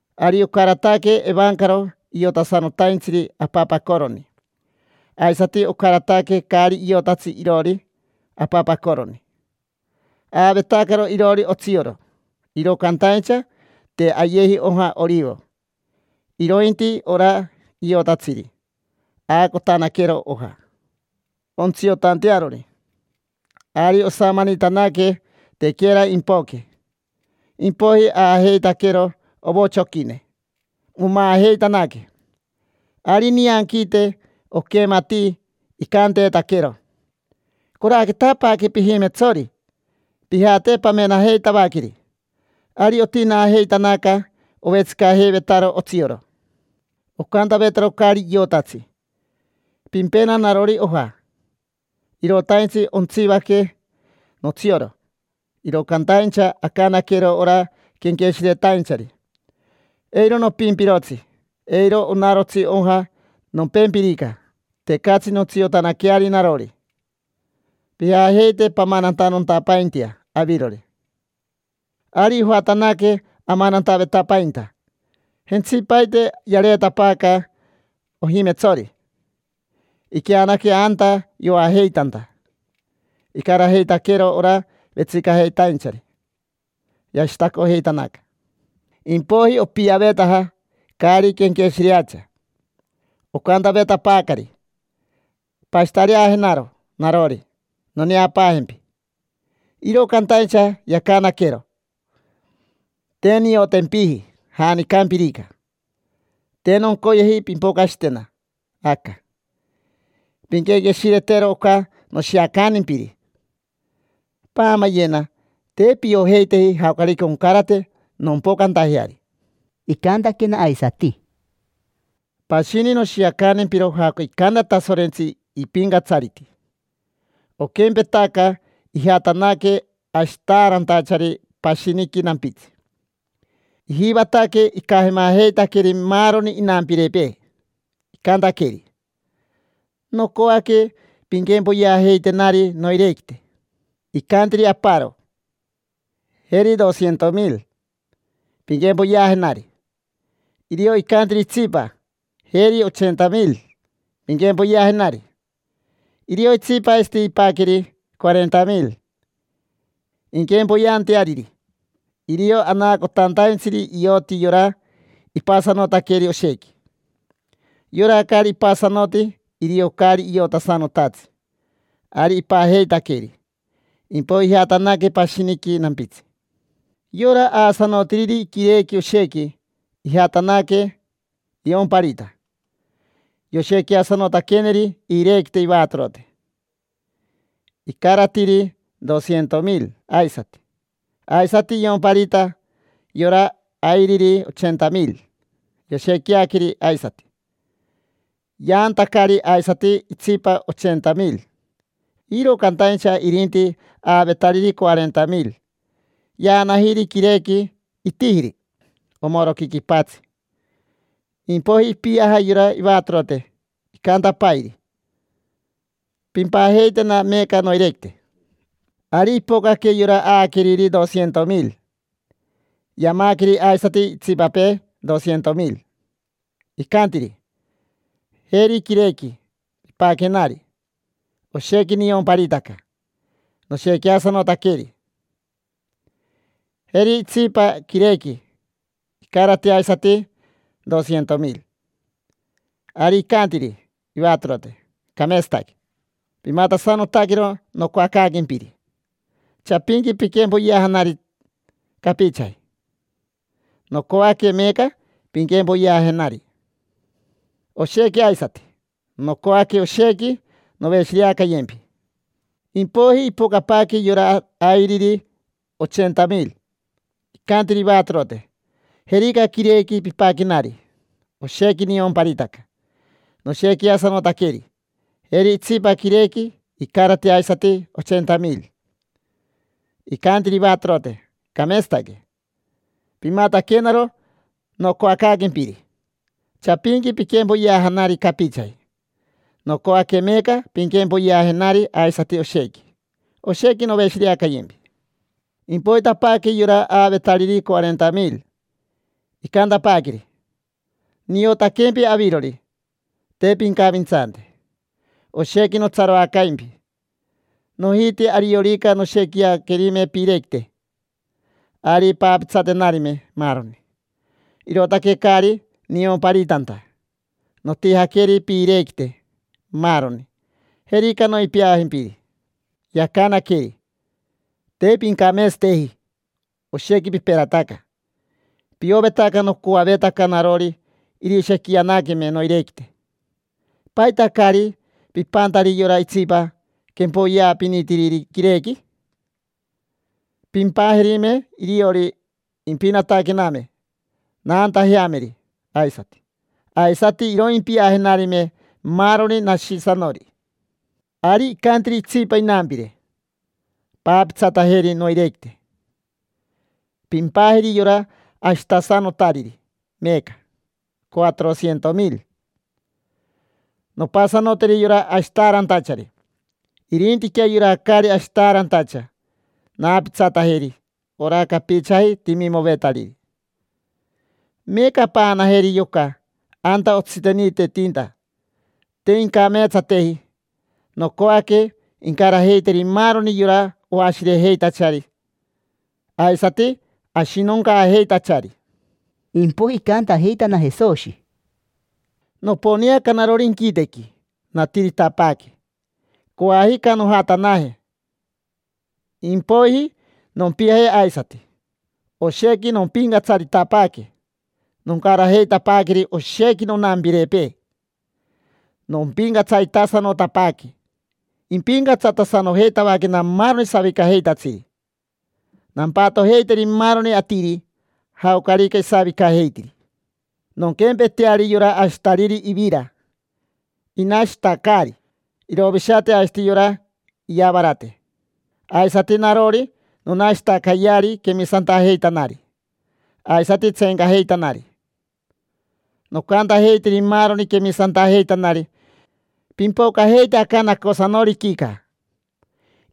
Ari ocarataque evancaro iotasanotaintsiri apapacoroni, aisati ocarataque caari iotatsi iroori apapacoroni. Aavetacaro iroori otsioro, iro cantaincha te ayeji oja orivo. Irointi ora iotatsiri, aacotanaquero oja, ontsiotantearori. Ari osamanitanaque, tequera impoque. Impoiji aajeitaquero ovochoquine, omaajeitanaque. Ari nianquiite oquematii icanteetaquero: “Coraquetapaaque pijimetsori, pijate pamenajeitavaqueri”. Ari otinaajeitanaca, ovetsicajeivetaro otsioro. Ocantavetaro caari iotatsi: “Pimpena narori oja, irotaintsi ontsivaque notsioro”. Iro cantaincha acanaquero ora quenqueshiretainchari: “Eiro nopimpirotsi, eiro onarotsi oja. Nompempirica, tecatsi nontsiotanaqueari narori. Pijajeite pamanantanontapaintea avirori”. Ari ojatanaque amanantavetapainta. Jentsipaite yareetapaaca ojimetsori, iqueanaque anta yoajeitanta, icarajeitaquero ora vetsicajeitainchari, yashitacojeitanaca. Impoiji opiavetaja caari quenqueshireacha, ocantavetapaacari: “Pashitareajenaro narori, noneapaajempi”. Iro cantaincha yacanaquero: “Te niotempiji, janicampirica. Te noncoyeji pimpocashitena aca”. Pinquenqueshiretero oca noshiacantimpiri: paamayena, te piojeiteji jaocarica oncarate nompocantajeari. Icantaquena aisati: —Pashini noshiacantempiro jaoca icanta Tasorentsi ipincatsariti. Oquempetaca ijatanaque ashitaarantachari pashiniqui nampitsi. Ijivataque icajemajeitaqueri maaroni inampirepee, icantaqueri: “Nocoaque pinquempoyeajeitenari noirequite”. Icantiri aparo: “Jeri S/.200,000, pinquempoyeajenari”. Irio icantiri itsipa: “Jeri S/.80,000, pinquempoyeajenari”. Irio itsipa aisati ipaqueri S/.40,000 inquempoyeanteariri. Irio anaacotantaintsiri ioti yora ipasanotaqueri oshequi. Yora caari ipasanoti, irio caari iotasanotatsi. Ari ipajeitaqueri, impoiji ijatanaque pashiniqui nampitsi. Yora aasanotiriri quirequi oshequi ijatanaque iomparita. Yoshequiasanotaqueneri iirequite ivatorote, icaratiri S/.200,000 aisati. Aisati iomparita yora airiri S/.80,000. Yoshequiaqueri aisati, yaantacari aisati itsipa S/.80,000. Iro cantaincha irinti aavetariri S/.40,000, yaanajiri quirequi, itijiri omoroqui quipatsi. Impoiji ipiaja yora ivatorote, icantapairi: “Pimpajeitena meeca noirequite”. Ari ipocaque yora aaqueriri S/.200,000, yamaqueri aisati itsipapee S/.200,000. Icantiri: “Jeri quirequi pipaquenari. Oshequi niomparitaca, noshequiasanotaqueri. Jeri itsipa quirequi, icarati aisati S/.200,000”. Ari icantiri ivatorote: “Cameetsataque, pimatasanotaquero nocoacaaquempiri. Chapinqui piquempoyeajanari capichaji, nocoaque meeca pinquempoyeajenari oshequi aisati. Nocoaque oshequi noveshireacayempi”. Impoiji ipocapaaque yora airiri S/.80,000. Icantiri ivatorote: “Jerica quirequi pipaquenari. Oshequi niomparitaca, noshequiasanotaqueri. Jeri itsipa quirequi, icarati aisati S/.80,000”. Icantiri ivatorote: “Cameetsataque, pimataquenaro nocoacaaquempiri. Chapinqui piquempoyeajanari capichaji, nocoaque meeca pinquempoyeajenari aisati oshequi. Oshequi noveshireacayempi”. Impoitapaaque yora aavetariri S/.40,000, icantapaaqueri: “Niotaquempi avirori, te pincavintsante, oshequi notsaroacaimpi. Nojiti ariorica noshequiaquerime piirequite, ari paapitsatenarime maaroni, irootaque caari niomparitanta. Notijaqueri piirequite, maaroni. Jerica, noipiajimpiri”. Yacanaqueri: “Te pincameetsateji, oshequi piperataca. Piovetaca nocoavetaca narori irishequianaqueme noirequite. ¿Paita caari pipantari yora itsipa quempoyeapinitiriri quirequi? Pimpajerime iriori, impinataquename, naantajeameri aisati. Aisati iroimpiajenarime maaroni nashisanori”. Ari icantiri itsipa inampire: “Paapitsatajeri noirequite, pimpajeri yora ashitasanotariri meeca S/.400,000. Nompasanoteri yora ashitaarantachari. Irintiquea yora caari ashitaarantacha, naapitsatajeri ora capichaji timimovetariri. Meeca paanajeri yoca anta otsiteniitetinta: te incameetsateji. Nocoaque incarajeiteri maaroni yora oashirejeitachari aisati ashinoncaajeitachari”. Impoiji icantajeitana Jesoshi: —Noponeaca narori inquitequi, natiritapaaque. Coajica nojatanaje, impoiji nompiaje aisati; oshequi nompincatsaritapaaque, noncarajeitapaaqueri oshequi nonampirepee. Nompincatsaritasanotapaaque, impincatsatasanojeitavaquena maaroni savicajeitatsiri. Nampatojeiteri maaroni atiri, jaocarica isavicajeitiri. Nonquempeteari yora ashitariri ivira inashitacaari: irovishate aisati yora iyavarate; aisati narori nonashitacayeari quemisantajeitanari aisati tseencajeitanari. Noncantajeiteri maaroni quemisantajeitanari: “Pimpocajeite aca nacosanoriquica”.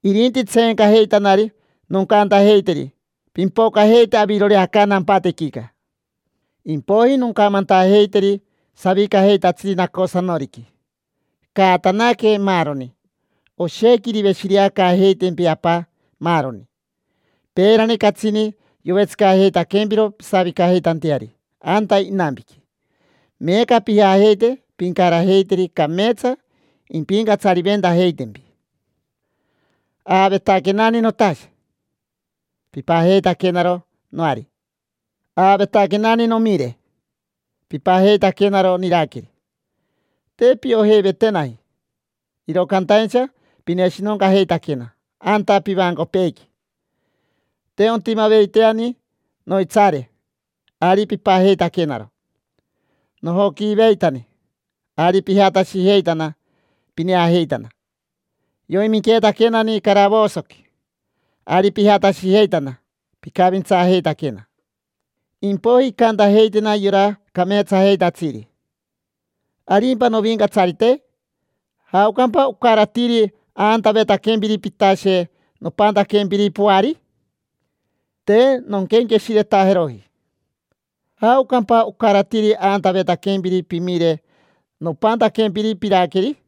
Irinti tseencajeitanari noncantajeiteri: “Pimpocajeite avirori aca nampatequica”. Impoiji noncamantajeiteri savicajeitatsiri nacosanoriqui: “Caatanaque, maaroni, oshequi iriveshireacaajeitempi Apa maaroni. Peerani, catsini yovetsicajeitaquempiro pisavicajeitanteari anta inampiqui. Meeca pijajeite pincarajeiteri. Cameetsa impincatsariventajeitempi. Aavetaquenani notashe, pipajeitaquenaro noari. Aavetaquenani nomire, pipajeitaquenaro niraqueri. Te piojeivetenaji, iro cantaincha pineshinoncajeitaquena anta pivancopeequi. Te ontimaveiteani noitsaare, ari pipajeitaquenaro. Nojoquiiveitani, ari pijatashijeitana pineajeitana. Yoiminqueetaquenani caravosoqui, ari pijatashijeitana, picavintsaajeitaquena”. Impoiji incantajeitena yora cameetsajeitatsiri: “¿Arimpa novincatsarite? ¿Jaocampa ocaratiri aantavetaquempiri pitashe nopantaquempiri poari? Te nonquenqueshiretajeroji. ¿Jaocampa ocaratiri aantavetaquempiri pimire nopantaquempiri piraqueri?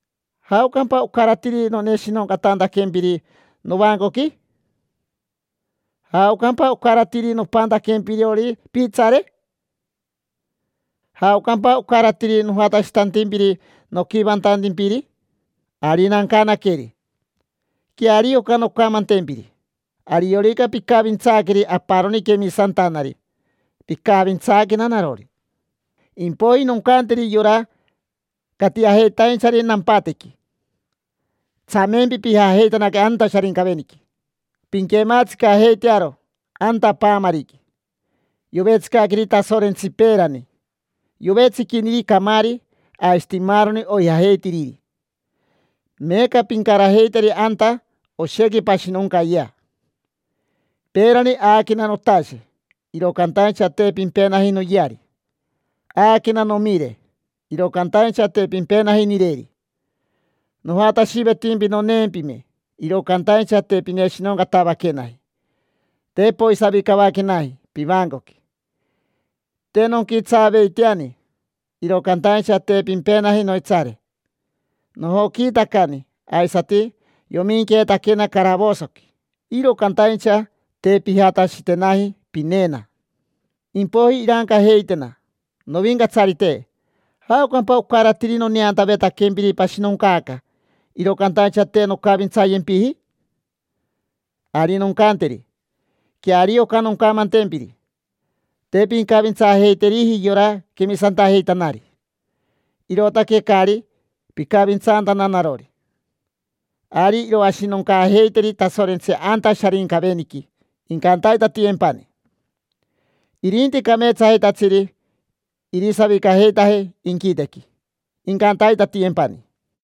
¿Jaocampa ocaratiri noneshinoncatantaquempiri novancoqui? ¿Jaocampa ocaratiri nopantaquempirori piitsaare? ¿Jaocampa ocaratiri nojatashitantimpiri noquivantantimpiri?” Ari nancanaqueri: “Queario oca noncamantempiri: ariorica picavintsaaqueri aparoni quemisantanari picavintsaaquena narori”. Impoiji noncanteri yora catiajeitainchari nampatequi: “Tsamempi pijajeitanaque anta Sharincaveniqui, pinquematsicajeitearo anta paamariqui yovetsicaqueri Tasorentsi peerani. Yovetsiquiniri camaari aisati maaroni oijajeitiriri. Meeca pincarajeiteri anta, oshequi pashinoncayea. Peerani aaquena notashe, iro cantaincha te pimpenaji noyeari. Aaquena nomire, iro cantaincha te pimpenaji nireri. Nojatashivetimpi noneempime, iro cantaincha te pineshinoncatavaquenaji, te poisavicavaquenaji pivancoqui. Te nonquitsaaveiteani, iro cantaincha te pimpenaji noitsaare. Nojoquiitacani aisati yoiminqueetaquena caravosoqui, iro cantaincha te pijatashitenaji pineena”. Impoiji irancajeitena: “Novincatsarite, ¿jaocampa ocaratiri noneantavetaquempiri pashinoncaaca, iro cantaincha te noncavintsayempiji?” Ari noncanteri: “Queario oca noncamantempiri: te pincavintsaajeiteriji yora quemisantajeitanari, irootaque caari picavintsantana narori”. Ari iroashinoncaajeiteri Tasorentsi anta Sharincaveniqui, incantaitatiyempani. Irinti cameetsajeitatsiri irisavicajeitaje inquitequi, incantaitatiyempani.